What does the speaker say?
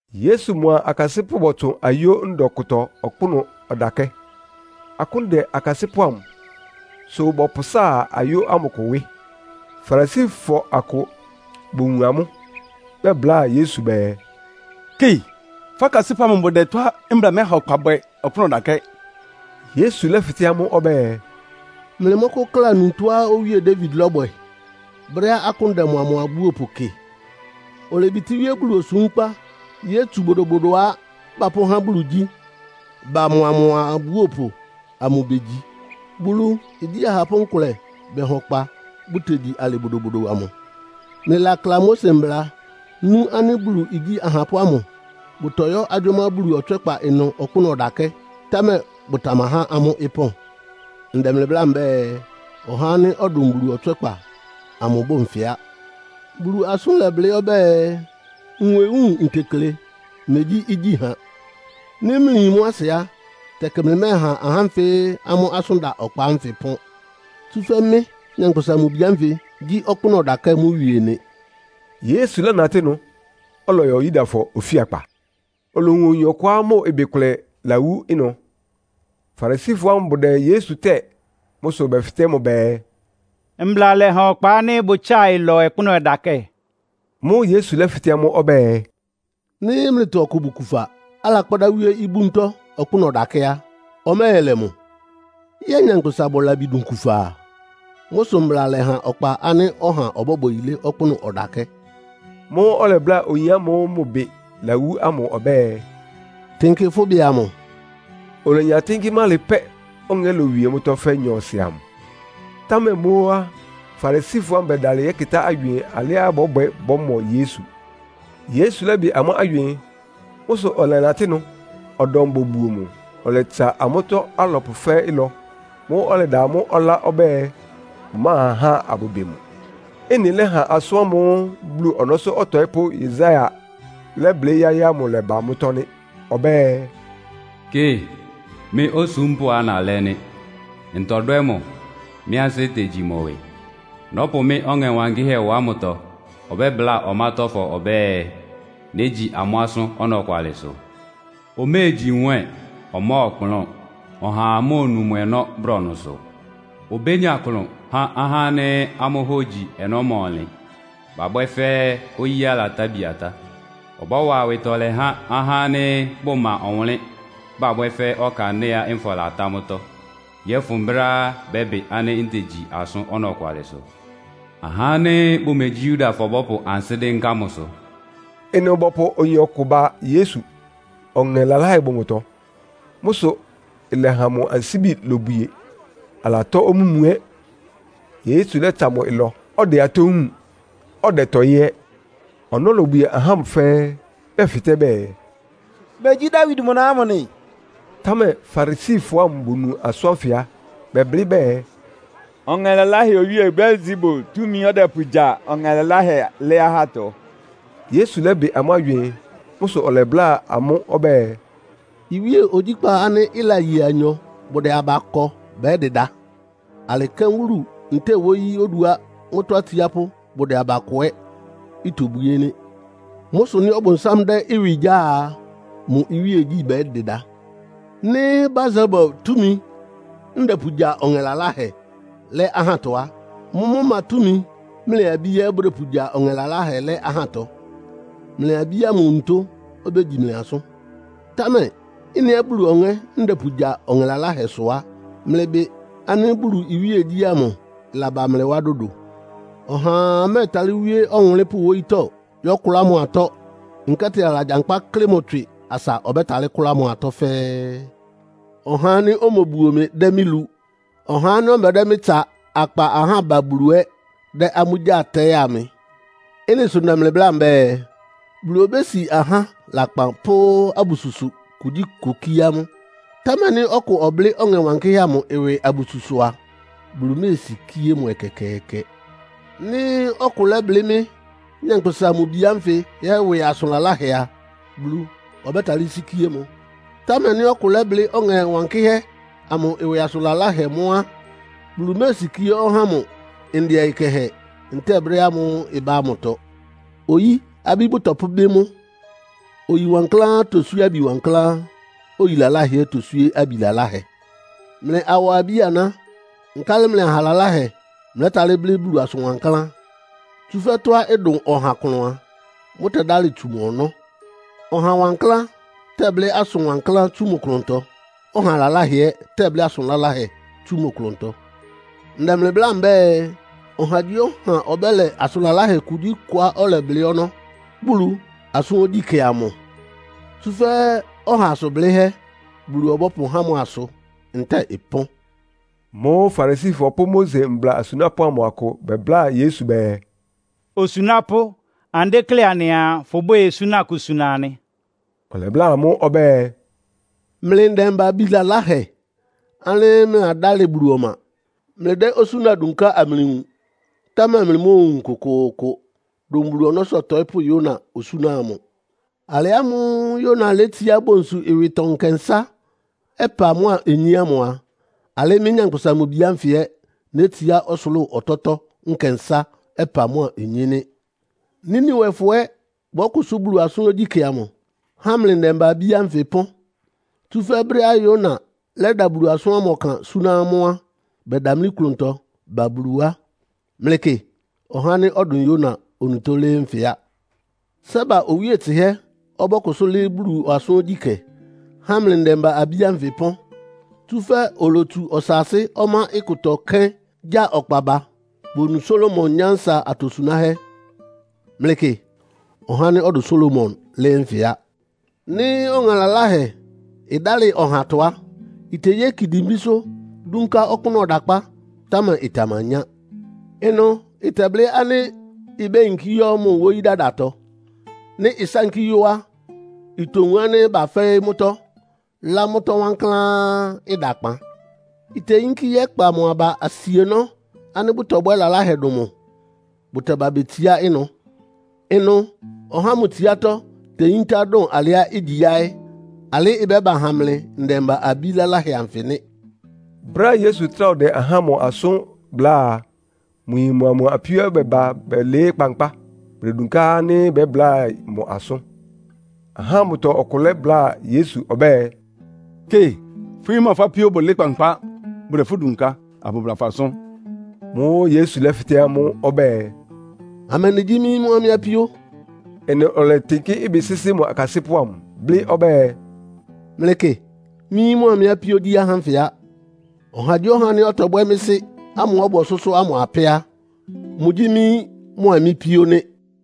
Yesu mʋa mʋ akasɩ́pʋ́ bɔtsʋn ayó ndɔ kʋtɔ ɔkpʋ́nʋ́ ɔdakɛ́. Akʋ́n dɛ akasɩ́pʋ́ amʋ, sʋ bɔpʋsáa ayó ámʋ kʋ wɩ́. Farisifɔ akʋ bowun amʋ́, bɛbláa Yesu bɛɛ, “Kɩ, fʋ́ akasɩ́pʋ́ amʋ bʋdɛ tɔ́á mbla mɛha ɔkpa bwɛ ɔkpʋ́nʋ́ ɔdakɛ́!” Yesu lɛ́fɩtɛ́ amʋ́ ɔbɛ́ɛ, “Mlɩmɔ́kʋ́kla nu tɔ́á Owíe Dawid lɔ́bwɛ brɛ́á akʋ́n dɛ mʋa mʋ abúopʋ kɩ? Olebitíwíé Bulu osúmkpa yótsu bodobodoá bapʋ́há Bulu igyí ba, mʋa mʋ abúopʋ amʋ begyi. Bulu igyí ahapʋ́ nkʋlɛ bɛha ɔkpa, bʋtegyi alɩ bodobodo amʋ. Mlɩlakla Mose Mbla, nú ánɩ́ Bulu igyí ahapʋ́ ámʋ bʋtɔyɔ́ agyʋ́má Bulu ɔtswɛ́kpa ɩnʋ ɔkpʋ́nʋ́ ɔdakɛ́, támɛ bʋtamahá amʋ́ ɩpɔ́n. Ndɛ mlɩ bláa mbɛ́ɛ, ɔhá ánɩ́ ɔdʋn Bulu ɔtswɛ́kpa amʋ bʋ́ʋ nfɩ á. Bulu asʋ́n lɛblɩ́ ɔbɛ́ɛ, ‘Nwewúun ntekle, megyí igyíha.’ Nɩ́ mlɩyin mʋ́ asɩ á, tɛkɩ mlɩmɛ́ɛha ahá ánfɩ amʋ́ asʋ́n da ɔkpa ánfɩ ɩpɔ́n. Tsúfɛ́ mɩ́, Nyankpʋsa-Mʋ-Bi ánfɩ gyí ɔkpʋ́nʋ́ ɔdakɛ́ mʋ wie nɩ.” Yesu lɛ́natɩ́ ɩnʋ, ɔlɔyɔ Yudafɔ ofíakpa. Olowun oyin ɔkʋá mʋ ɩbɩ kʋlɛ lawú ɩnʋ. Farisifɔ ámʋ bʋdɛ Yesu tɛ́ɛ. Mʋ́ sʋ bɛfɩtɛ́ mʋ bɛɛ, “Mbla lɛha ɔkpa ánɩ́ bʋtsáa ɩlɔ ɔkpʋ́nʋ́ ɔdakɛ́?” Mʋ́ʋ́ Yesu lɛ́fɩtɛ́ amʋ́ ɔbɛ́ɛ, “Nɩ́ mlɩtɔ ɔkʋ bʋ kufa, alakpádá wíé ibúntɔ́ ɔkpʋ́nʋ́ ɔdakɛ́ á, ɔmɛ́ɛlɛ mʋ? Yɛ́ɛ nyankpʋsa bʋ labi dʋn kufa a? Mʋ́ sʋ mbla lɛha ɔkpa ánɩ́ ɔha ɔbɔ́bwɛ yilé ɔkpʋ́nʋ́ ɔdakɛ́.” Mʋ́ʋ́ ɔlɛbláa oyin ámʋ́ʋ́ mʋ ɩbɩ lawú ámʋ ɔbɛ́ɛ, “Tɩnkɩ fʋ́ ɩbɩ amʋ.” Olenya tɩ́nkɩ́ mʋ́ alɩ pɛ́, ɔŋɛ́ lowie mʋ́tɔ́ fɛ́ nyɔɔsɩ amʋ. Támɛ mʋ́ ó á, Farisifɔ ámʋ bɛdalɩ yɛ́kɩtá agywɩɩn alɩá bɔ́bwɛ bɔ́mɔ Yesu. Yesu lɛ́bɩ amʋ́ agywɩɩn. Mʋ́ sʋ ɔlɛnatɩ́ ɩnʋ. Ɔdɔm bobuo mʋ, ɔlɛtsa amʋ́tɔ́ alɔpʋ fɛ́ɛ́ ɩlɔ. Mʋ́ʋ́ ɔlɛda amʋ́ ɔlá ɔbɛ́ɛ, bʋmáha ahá abʋbɩ mʋ. Ɩ́nɩ lɛ́ha asʋ́n ámʋ́ʋ́ Bulu ɔnɔ́sʋ́ ɔtɔɩ́pʋ́ Yesaia lɛ́blɩ́ yáɩ́ ámʋ lɛ́ba mʋ́tɔ́ nɩ́. Ɔbɛ́ɛ, “Kɩ, mɩ́ osúmpʋ́á nalɛ́ nɩ́. Ntɔdwɛ́ mʋ, mɩ ansɩ́ tegyi mʋ ɩwɩ. Nɔ́pʋ mɩ́ Ɔŋɛ Wankɩ́hɛ́ wá mʋtɔ. Ɔbɛ́bláa ɔmátɔ́fɔ ɔbɛ́ɛ, ‘négyi amʋ́ asʋ́n ɔnɔkwalɩsʋ.’ Oméegyi nwɛ́ɛn, ɔmɔ́ɔkplʋ́n. Ɔhaa móonu mʋ ɔnɔ́ brɔnʋsʋ. Obénya klʋn há ahá ánɩ́ amʋ́ hógyi ɔnɔ́ ma ɔnlɩn, bábwɛ́ fɛ́ oyíá ɩlatá bia tá. Ɔbɔ́wa awɩtɔlɛ há ahá ánɩ́ bʋma ɔwʋnlɩ́n, bábwɛ́ fɛ́ ɔkandɩ́ɛá nfɔ latá mʋ́tɔ́, yɔ́fʋn brɛ́á bɛ́bɩ ánɩ́ ntegyi asʋ́n ɔnɔkwalɩsʋ. Ahá ánɩ́ bʋmegyí Yudafɔ bɔ́pʋ ansɩ́ dɩ́nká mʋsʋ.” Ɩnʋ bɔpʋ oyin ɔkʋ ba Yesu, ɔŋɛ laláhɛ bʋ mʋtɔ. Mʋ́ sʋ ɩlɛha mʋ ansíbi lobwie; álatɔ́ omúmu ɛ́. Yesu lɛ́tsa mʋ ɩlɔ, ɔdɛ atɔ́ wúun, ɔdɛtɔɩ́ ɛ́. Ɔnɔ́ lobwie ahá ámʋ fɛ́ɛ́, bɛfɩtɛ́ bɛɛ, “Megyí Dawid mʋ na ámʋ nɩ?” Támɛ Farisifɔ ámʋ bonu asʋ́n ánfɩ á, bɛblɩ́ bɛɛ, “Ɔŋɛ laláhɛ owíe Beelsebul túmi ɔ́dɛpʋgya ɔŋɛ laláhɛ lɛ́ ahátɔ.” Yesu lɛ́bɩ amʋ́ agywɩɩn. Mʋ́ sʋ ɔlɛbláa amʋ́ ɔbɛ́ɛ, “Iwíe ogyíkpá ánɩ́ ɩlaye anyɔ, bʋdɛ aba kɔ bɛ́dɩda. Alɩ kɛ́n wúlu ntɛ́ɛ wóyí oduá mʋ́tɔ́ atsiápʋ́ bʋdɛ aba kɔ ɛ́ itobwíé nɩ́. Mʋ́ sʋ nɩ́ Ɔbʋnsám dɛ́ mʋ ɩwɩ gyáa a, mʋ iwíegyí bɛ́dɩda. Nɩ́ Beelsebul túmi ndɛpʋgya ɔŋɛ laláhɛ lɛ́ ahátɔ á, mʋ́mʋ́ ma túmi mlɩ abí ɛ́ bʋdɛpʋgya ɔŋɛ laláhɛ lɛ́ ahátɔ? Mlɩ abí ámʋ onutó obégyi mlɩ asʋ́n. Támɛ ɩ́nɩá Bulu Ɔŋɛ́ ndɛpʋgya ɔŋɛ laláhɛ sʋ á, mlɩbɩ ánɩ́ Bulu iwíegyí ámʋ laba mlɩ wá dodo.” Ɔhaa mɛ́ɛtalɩ́ wíé ɔwʋnlɩ́npʋ́ wóyítɔ́ yɔ́kʋlá mʋ atɔ́, nkɛ́tɩ alagyankpá kɩ́klɩ mʋ tswɩ, asa ɔbɛ́talɩ́ kʋ́lá mʋ atɔ́ fɛ́ɛ́. Ɔhá ánɩ́ omobuo mɩ dɛ́ mɩ́ lu. Ɔhá ánɩ́ ɔmɛdɛ́ mɩ́ tsa akpa ahá ba Bulu ɛ́ dɛ́ amʋ́ gyáa tɛɩ́a mɩ. Ɩ́nɩ sʋ ndɛ mlɩ bláa mbɛ́ɛ, Bulu obési ahá lakpan pʋ́ abususʋ kugyíkʋ kíé amʋ́. Támɛ nɩ́ ɔkʋ ɔblɩ́ Ɔŋɛ Wankɩ́hɛ́ amʋ ɩwɩ abususʋ a, Bulu méesikíé mʋ ɛkɛkɛɛkɛ. Nɩ́ ɔkʋ lɛ́blɩ́ mɩ́, Nyankpʋsa-Mʋ-Bi ánfɩ ɛ́ ɩwɩ asʋn laláhɛ a, Bulu ɔbɛ́talɩ́ sikíé mʋ. Támɛ nɩ́ ɔkʋ lɛ́blɩ́ Ɔŋɛ Wankɩ́hɛ́ amʋ ɩwɩ asʋn laláhɛ mʋ́ á, Bulu méesikíé ɔhá ámʋ ndɛ ɔyɩ kɛhɛ, ntɛ́ɛ brɛ́ ámʋ́ʋ́ ɩbá ámʋtɔ. Oyí abí bʋtɔpʋ́bɩ́ mʋ́. Oyi wankláán toswíé abi wankláán. Oyi laláhɛ ɛ́ toswíé abi laláhɛ. Mlɩ awɔ abí-aná! Nkálɩ mlɩ aha laláhɛ mlɛ́talɩ́ blɩ́ asʋn wankláán? Tsúfɛ́ tɔ́á ɩdʋn ɔha klʋn a, mʋ́tɛ́dálɩ tsu mʋ ɔnɔ́. Ɔha wankláán tɛblɩ́ asʋn wankláán tsú mʋ klʋntɔ, ɔha laláhɛ ɛ́ tɛblɩ́ asʋn laláhɛ tsú mʋ klʋntɔ. Ndɛ mlɩ bláa mbɛ́ɛ, ɔhagyíɔha ɔbɛ́lɛ asʋn laláhɛ kugyíkʋá ɔlɛblɩ́ ɔnɔ́ Bulu asʋ́n ogyíkɛ́ amʋ. Tsúfɛ́ ɔha asʋn blɩ́hɛ́ Bulu ɔbɔ́pʋhá mʋ asʋ ntɛ́ɛ ɩpɔ́n. Mʋ́ʋ́ Farisifɔ pʋ́ Mose mbla asunápʋ́ amʋ akʋ bɛbláa Yesu bɛɛ, “Osunápʋ́, anɩdéklé anɩaa fʋbwɛ́ɛ osúna kʋ suna anɩ.” Ɔlɛbláa amʋ́ ɔbɛ́ɛ “Mlɩ ndɛmba-abí laláhɛ ánɩ́ mlɩladálɩ Bulu ɔma. Mlɩdɛ́ osúna dunká amlɩwun, támɛ mlɩmóowun kʋkʋʋkʋ dʋn Bulu ɔnɔ́sʋ́ ɔtɔɩ́pʋ́ Yona osúna amʋ. Alɩ ámʋ́ʋ́ Yona létsiá bonsu ɩwɩtɔ nkɛnsá, ɔpa mʋ́a onyé ámʋ a, alɩ́ mɩ́, Nyankpʋsa-Mʋ-Bi ánfɩ ɛ́ nétsiá ɔsʋlʋ́ʋ ɔtɔ́tɔ́ nkɛnsá, ɔpa mʋ́a onyé nɩ́. Niniwefɔ ɛ́ bɔ́kʋsʋ́ Bulu asʋ́n ogyíkɛ́ amʋ, há mlɩ ndɛmba-abí ánfɩ ɩpɔ́n. Tsúfɛ́ brɛ́á Yona lɛ́da Bulu asʋ́n ɔkan súná amʋ́ á, bɛdamlí klʋntɔ ba Bulu wá. Mlɩkɩ, ɔhá ánɩ́ ɔdʋn Yona onutó lɩ́ɩ́ nfɩ á. Seba owíe tsɩhɛ́ ɔbɔ́kʋsʋ́ lɩ́ɩ́ Bulu asʋ́n ogyíkɛ, há mlɩ ndɛmba-abí ánfɩ ɩpɔ́n. Tsúfɛ́ olotsu ɔsaasɩ́ ɔmá ɩkʋtɔ kéín gya ɔkpa ba, bonu Salomo nyánsa atosunáhɛ́. Mlɩkɩ, ɔhá ánɩ́ ɔdʋn Salomo lɩ́ɩ́ nfɩ á.” “Nɩ́ ɔŋɛ laláhɛ ɩdálɩ ɔhatɔ á, iteyéki dimbísʋ́ dúnká ɔkpʋ́nʋ́ ɔdakpá, támɛ ɩtamanyá. Ɩnʋ ɩtɛblɩ́ ánɩ́ ibéyinkí yɔ́ mʋ́ wóyí dadatɔ. Nɩ́ ɩsánkí yɔ́ á, itowun ánɩ́ bafɛ́ɩ́ mʋ́tɔ́, lá mʋ́tɔ́ wankláán, ɩda kpan. Iteyínkí yɛ́kpa mʋ́ aba asienɔ́ ánɩ́ bʋtɔbwɛ́ lalahɛ dʋn mʋ́, bʋtɛba betsiá ɩnʋ. Ɩnʋ ɔhá ámʋ tsiátɔ́ teyíntá dʋn alɩá igyi yáɩ́. Alɩ́ ɩbɛ́ba ha mlɩ ndɛmba-abí laláhɛ anfɩ nɩ́.” Brɛ́á Yesu trá ɔdɛ ahá ámʋ asʋ́n bláa a, mʋ yin mʋa mʋ apíó bɛba bɛlɩɩ́ kpankpá, bʋdedunká ánɩ́ bɛ́bláa mʋ asʋ́n. Ahá ámʋtɔ ɔkʋ lɛ́bláa Yesu ɔbɛ́ɛ, “Kɩ, fʋ́ yín mʋa fʋ́ apíó bʋlɩɩ́ kpankpá. Bʋdɛ fʋ́ dunká, abʋbla fʋ asʋ́n.” Mʋ́ʋ́ Yesu lɛ́fɩtɛ́ mʋ ɔbɛ́ɛ, “Amɛndɩ gyí mɩ́ yín mʋa mɩ́ apíó?” Ɩnʋ ɔlɛtɩnkɩ́ ɩbɩ sɩ́sɩ́ mʋ akasɩ́pʋ́ amʋ, blɩ́ ɔbɛ́ɛ, “Mlɩkɩ, mɩ́ yín mʋa mɩ́ apíó gyí ahá ánfɩ á. Ɔhagyíɔha ánɩ́ ɔtɔbwɛ́ mɩ́ Sɩ́ ámʋ́ʋ́ ɔbʋ ɔsʋ́sʋ́ ámʋ apɛ́ á, mʋgyí mɩ́ yín mʋ́a mɩ́ píó nɩ́.”